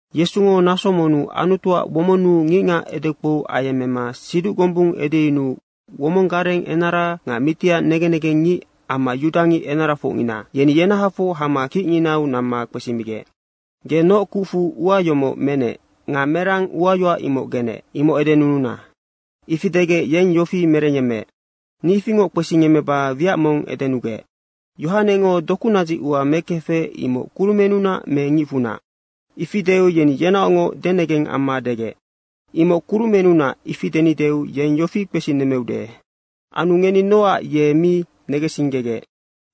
Yesungo naso monnu Anutuac womonnu ngicngac edekpou ayemmema siduc gombung edeyunuu womong gareng enara nga mitiac negen negengngic amma yudangic enarafocngina yeni yenahafoc hama kicnginau namma kpesimigec, “Ge noc kucfu ua yomoc menec nga merang uayoac imoc genec? Imoc edenununa.” Ifi degec yeng yofi merengyemmeec, “Ni ifingoc kpesingemmeba wiac mong edenugec, Yohanengo dokunadzic ua mekefec, imoc kurumennunac me ngicfunac?” Ifi deu yeni yenaocngoc denegeng amma degec, “‘Imoc kurumennunac.’ Ifi denideu yeng yofi kpesinemmeude, ‘Anu ngeni nocac ye mi negensinggegec?’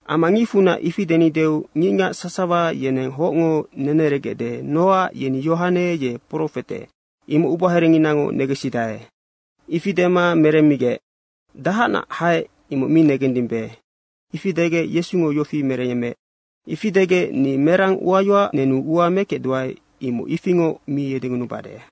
Amma ‘ngicfunac’ ifi denideu ngicngac sasawa yeneng hocngo neneregecde nocac yeni Yohane ye profete, imoc ubaherenginango negensidae.” Ifi dema meremmigec, “Dahacnac haec, imoc mi negendimbe.” Ifi degec Yesungo yofi merenec, “Ifi degec, ni merang uayoac nenu ua mekecduae, imoc ifingoc mi edengunubade.”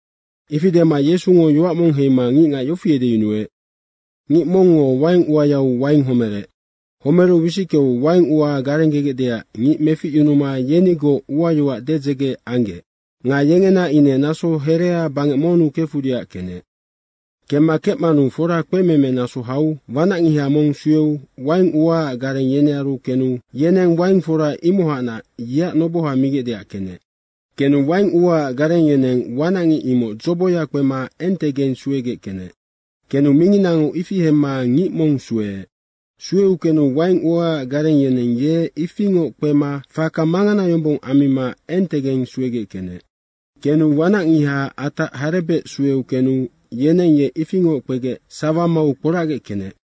Ifi dema Yesungo yoac mong heima ngicngac yofi edeyunuec, “Ngic mongngo waing uayau waing homerec. Homeru wisickeu waing ua garenggegecdeac ngic meficyunuma yenigoc uayoac dedzege anggec nga yengena ine naso herea bangec monnu kefudeac kenec. Kemma kecmanu fora kpememe naso hau wanacngiha mong sueu waing uaac gareng yenearu kenu yeneng waing fora imohacnac yeac noboha migecdeac kenec. Kenu waing uaac gareng yeneng wanacngic imoc dzoboya kpema entegeng suegec kenec. Kenu minginango ifi hemma ngic mong sueec. Sueu kenu waing uaac gareng yeneng ye ifingoc kpema faka mangana yombong ammima entegeng suegec kenec. Kenu wanacngiha atac harebec sueu kenu yeneng ye ifingoc kpegec sawa mau kporacgec kenec.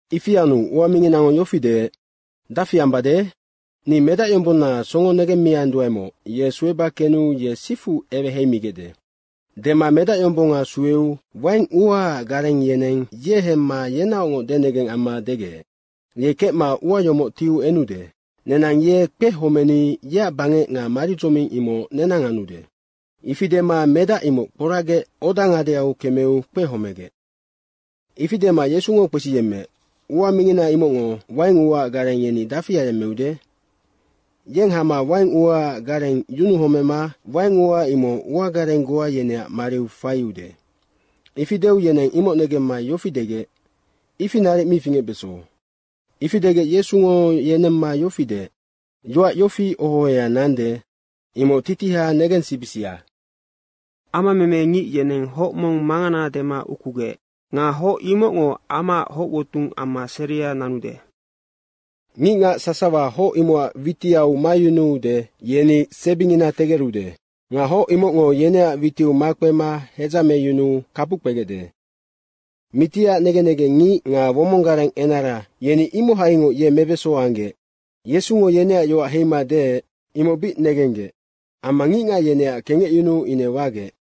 Ifi anu ua minginango yofi deec, ‘Dafi ambade? Ni medacyombonna songo negemmianduaemoc, ye sueba kenu ye sifu eweheimigecde.’ Dema medacyombonga sueu waing uaac gareng yeneng ye hemma yenaocngoc denegeng amma degec, ‘Yeng kecma ua yomoc tiu enude. Nenang ye kpehomeni yeac bangec nga maridzoming imoc nenang anude.’ Ifi dema medac imoc kporacgec oda ngadeau kemeu kpehomegec.” Ifi dema Yesungo kpesiyemmeec, “Ua mingina imocngo waing uaac gareng yeni dafi ayemmeude? Yeng hama waing uaac gareng yunuhomema waing ua imoc uagareng goa yeneac mariu faiude.” Ifi deu yeneng imoc negemma yofi degec, “Ifi naric mi fingecbeso.” Ifi degec Yesungo yenemma yofi deec, “Yoac yofi oho ohoya nande, imoc titiha negensibisia, ‘Amameme ngic yeneng hoc mong mangana dema ukugec. Nga hoc imocngo amaac hoc wotung amma seria nanude.’ Ngicngac sasawa hoc imocac witiau mayunude, yeni sebingina tegerude. Nga hoc imocngo yeneac witiu makpema hedzameyunuu kapuc kpegecde.” Mitiac negen negengngic nga womong gareng enara yeni imohaingoc ye mebeso anggec. Yesungo yeneac yoac heima deec, imoc bic negenggec amma ngicngac yeneac kengecyunuu ine wagec.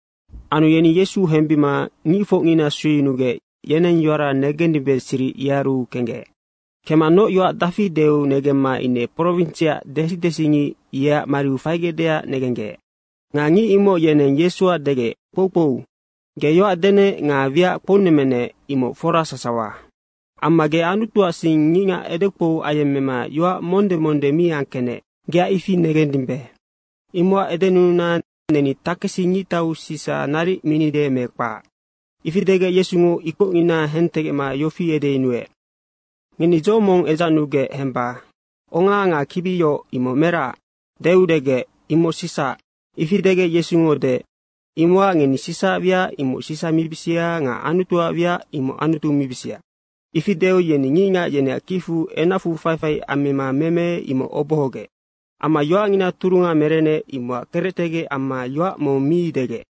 Anu yeni Yesu hembima ngicfocngina sueyunugec, yeneng yoara negendimbe siric yearu kenggec. Kemma noc yoac dafi deu negemma ine prowinsiac desi desingic yeac mariu faigecdeac negenggec. Nga ngic imoc yeneng Yesuac degec, “Kpoukpou, ge yoac denec nga wiac kpounemmenec, imoc fora sasawa. Amma ge Anutuac sing ngicngac edekpou ayemmema yoac monde monde mi angkecnec, geac ifi negendimbe. Imocac edenununa, neni takesi ngictau Sisa naric minide me kpac?” Ifi degec Yesungo ikocngina hentegecma yofi edeyunuec, “Ngeni dzo mong edzacnugec hemba. Onga nga kibi yoc, imoc meracac?” deu degec, “Imoc Sisaac.” Ifi degec Yesungo deec, “Imocac ngeni Sisaac wiac, imoc Sisa mibisia nga Anutuac wiac, imoc Anutu mibisia.” Ifi deu yeni ngicngac yeneac kicfu enacfu faifai ammima meme, imoc obohogec. Amma yoacngina turunga merenec, imocac kerectegec amma yoac mong mi degec.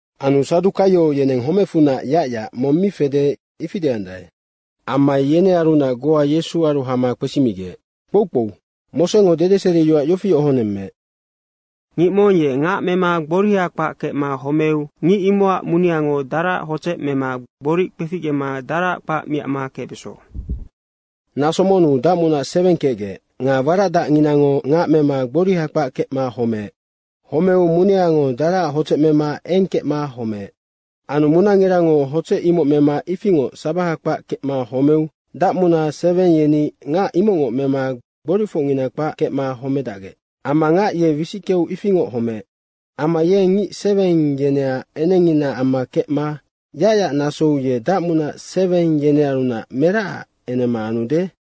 Anu Sadukaio yeneng homecfunac yacyac mong mi fede, ifi deandae. Amma yenearunac goa Yesuaru hama kpesimigec, “Kpoukpou, Mosengo dedeseriyoac yofi ohonemmeec, ‘Ngic mong ye ngac mema gboriha kpac kecma homeu ngic imocac muneango daraac hodzec mema gboric kpeficgema daraac kpac miacma kecbeso.’ Naso monnu dacmunac seweng kecgec nga waracdacnginango ngac mema gboriha kpac kecma homeec. Homeu muneango daraac hodzec mema eng kecma homeec. Anu munangirango hodzec imoc mema ifingoc sabaha kpac kecma homeu dacmuna seweng yeni ngac imocngoc mema gboricfocngina kpac kecma homedacgec amma ngac ye wisickeu ifingoc homeec. Amma yeng ngic seweng yeneac enengngina amma kecma yacyac nasou ye dacmunac seweng yenearunac meracac enema anude?”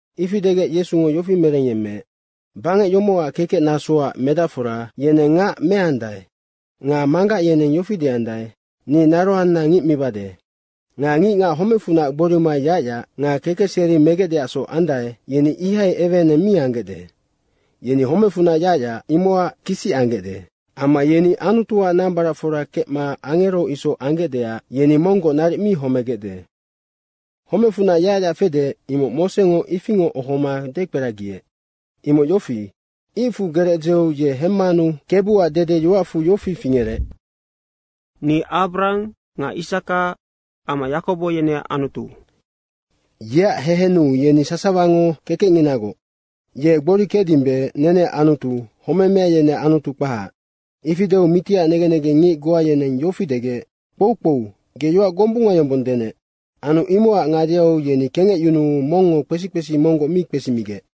Ifi degec Yesungo yofi merengyemmeec, “Bangec yomocac kekec nasoac medacfora yeneng ngac meandae nga manggac yeneng yofi deandae, ‘Ni naroanna ngic mibade.’ Nga ngicngac homecfunac gborima yacyac nga kekeseri megecdeacsoc andae, yeni ihai eweeneng mi anggecde. Yeni homecfunac yacyac, imocac kisic anggecde. Amma yeni Anutuac nambaracfora kecma angero isoc anggecdeac yeni monggoc naric mi homegecde. Homecfunac yacyac fede, imoc Mosengo ifingoc ohoma dekperagiec. Imoc yofi, icfu gerec dzeu ye hemmanu Kebuac dede yoacfu yofi fingerec, ‘Ni Abrahang nga Isaka amma Yakobo yeneac Anutu.’ Yeac hehennu yeni sasawango kekecnginagoc. Ye gbori kecdimbe, neneac Anutu, homemea yeneac Anutu kpahac.” Ifi deu mitiac negen negengngic goa yeneng yofi degec, “Kpoukpou, ge yoac gombunga yombong denec.” Anu imocac ngadeau yeni kengecyunuu mongngo kpesi kpesi monggoc mi kpesimigec.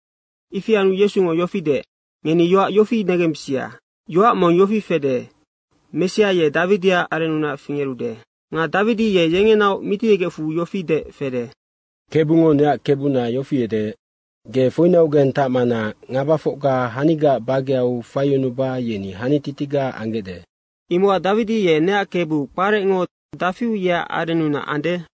Ifi anu Yesungo yofi deec, “Ngeni yoac yofi negembisia, yoac mong yofi fede, ‘Messia ye Dawidiac arennunac fingerude.’ Nga Dawidi ye yengenaoc Mitiyegecfu yofi deec fede, ‘KEBUNGO neac Kebuna yofi edeec, “Ge foinaugeng tacmana ngabafocga hanigaac bageau faiyunuba yeni hanititiga anggecde.” ’ Imocac Dawidi ye ‘Neac Kebu’ kparecngo dafiu yeac arennunac ande?”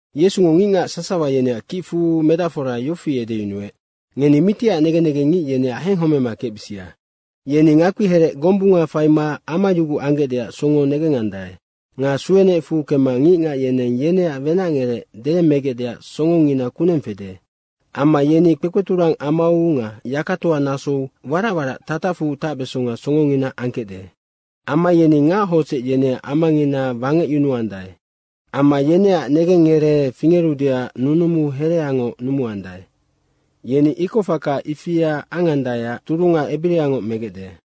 Yesungo ngicngac sasawa yeneac kicfu medacfora yofi edeyunuec, “Ngeni mitiac negen negengngic yeneac henghomema kecbisia. Yeni ngakpi herec gombunga faima amayuguc anggecdeac songo negengandae nga suenecfu kemma ngicngac yeneng yeneac wenacngerec deyemmegecdeac songongina kuneng fede. Amma yeni kpekpeturang amau nga yakatoa nasou warac warac tatacfu tacbesonga songongina angkecde. Amma yeni ngac hodzec yeneac amangina wangecyunuandae. Amma yeneac negengngeree fingerudeac nunumu hereangoc numuandae. Yeni ikocfaka ifia angandaeac turunga ebiriangoc megecde.”